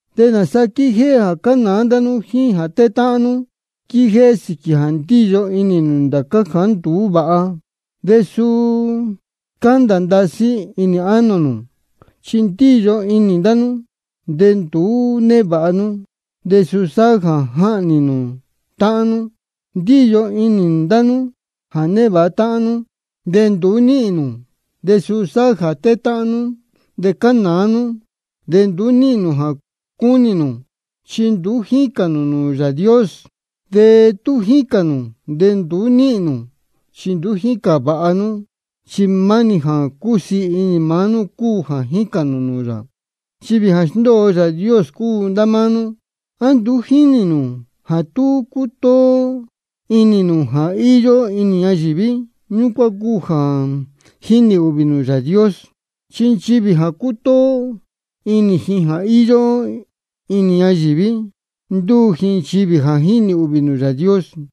¿De nāsa quíjéhé jā cánāá ndá nú jíín jā tétáhán nú? Quíjéhé sīquī jā ndíyo inī nū ndācá jāá nduú vāha, de suu scándā ndasí inī ánō nū. Chi ndíyo inī ndá nú, de nduú névāha nú, de suu sáhá jā jáhnī nū ndīyi. Ndíyo inī ndá nú jā névāha táhán nú, de nduú níhīn nū, de suu sáhá jā tétáhán nú de cánāá nú. De nduú níhīn nū jā cúnī nū, chi nduú jícān nū nūū Yāā Dios. De tú jícān nū, de nduú níhīn nū, chi nduú jícān vāha nú, chi maá-ni jā cúsiī inī maá nú cúu jā jícān nū nūū yā. Nchivī jā sndóo Yāā Dios cúu ndá máá nú. ¿A nduú jínī nū jā tú cútóó inī nū jā íyó inī ñayīví, ñúcuán cúu jā jínī ūhvī nū Yāā Dios? Chi nchivī jā cútóó inī jā íyó inī ñayīví, ndúu ji nchivī jā jínī ūhvī nūū Yāā Dios.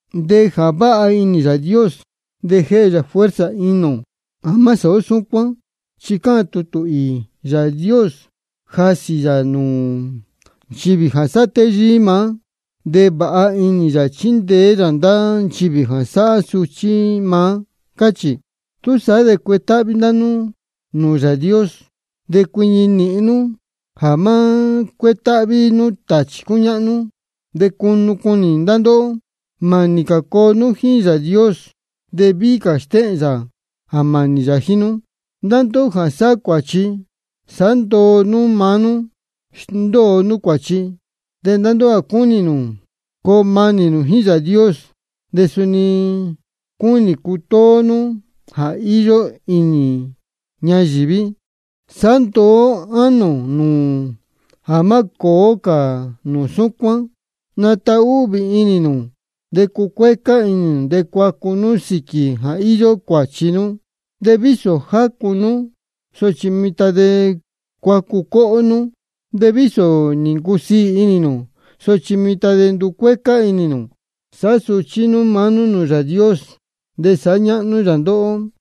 De jā váha inī Yāā Dios, de jéhe yā fuerza inī ō jā má sāhá ó súcuán. Chi cáhān tutū īī: Yāā Dios jásī yā nūū nchivī jā sáhá téyíí maá, de vāha inī yā chíndeé yā ndá nchivī jā sáhá suchí maá, cáchī. Túsaá de cuetáhví ndá nú nūū Yāā Dios. De cuiñi nīhin nú jā má cuétáhví nú tāchī cúñáhnú, de cunu cunī ndá ndóhó. Mānī cā coo nú jíín Yāā Dios, de víhí cā stéhēn yā jā mānī yā jíín nú. Ndá ndóhó jā sáhá cuāchi, sāhá ndoo nú maá nú, sndóo nú cuāchi. De ndá ndóhó jā cúnī nū coo manī nū jíín Yāā Dios de suni cúnī nū cutóó nú jā íyó inī ñayīví, sāhá ndoo nú ánō nū jā má cōó cā nū súcuán. Natahúhvī inī nū, de cucuécá inī nū, de cuacu nú sīquī jā íyó cuāchi nú. De vísō nī jācū nū, sochi mitan de cuacu cóhó nú. De vísō nī ncusiī inī nū, sochi mitan de nducuécá inī nū. Sāhá suchí nú maá nú nūū Yāā Dios, de sāhá ñáhnú yā ndóhó.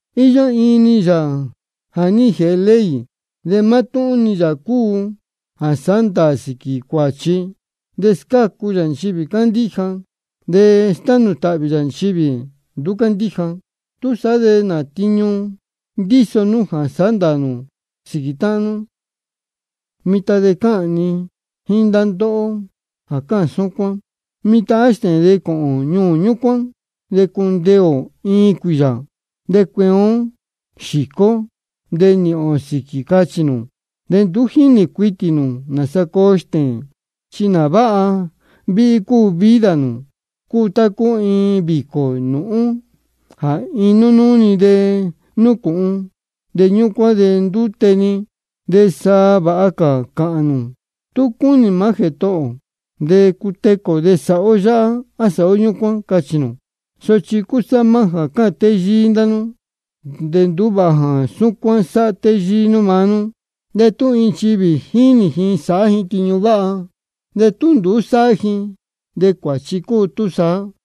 Iyó iin-ni Yāā jā ní jēhe ley, de mátúhún-ni yā cúu jā sáhá ndāā sīquī cuāchi. De scácu yā nchivī cándíja, de stánū tāhvī yā nchivī nduú cándíja. ¿Túsaá de nā tiñu ndíso nú jā sáhá ndāā nū sīquī táhán nú? Mitan de cáhān ni jíín ndá ndóhó jā cáhān súcuán: Mitan á stēēn de cōhōn ñuū ñúcuán, de cundeē ō iin cuīyā, de cueen ó xīcó ó de nīhīn ō sīquī, cáchī nū. De nduú jínī cuitī nū nāsa coo stēēn. ¿Chi nā váha víhí cúu vida nū? Cúu tá cúu iin vīcō nūhún jā iin núnúú-ni núcūhun, de ñúcuán de ndúte-ni. De sa vāha cā cāhān nū: Tú cúnī maá Jētohō ō de cutecū ō de sāhá ó yáhá á sāhá ó ñúcuán, cachī nū. Sochi cúsá maá jā cáhān téyíí ndá nú. De nduú vāha jā súcuán sáhá téyíí nú maá nú. De tú iin nchivī jínī ji sāhá ji tiñu váha, de tú nduú sáhá ji, de cuāchi cúu túsaá.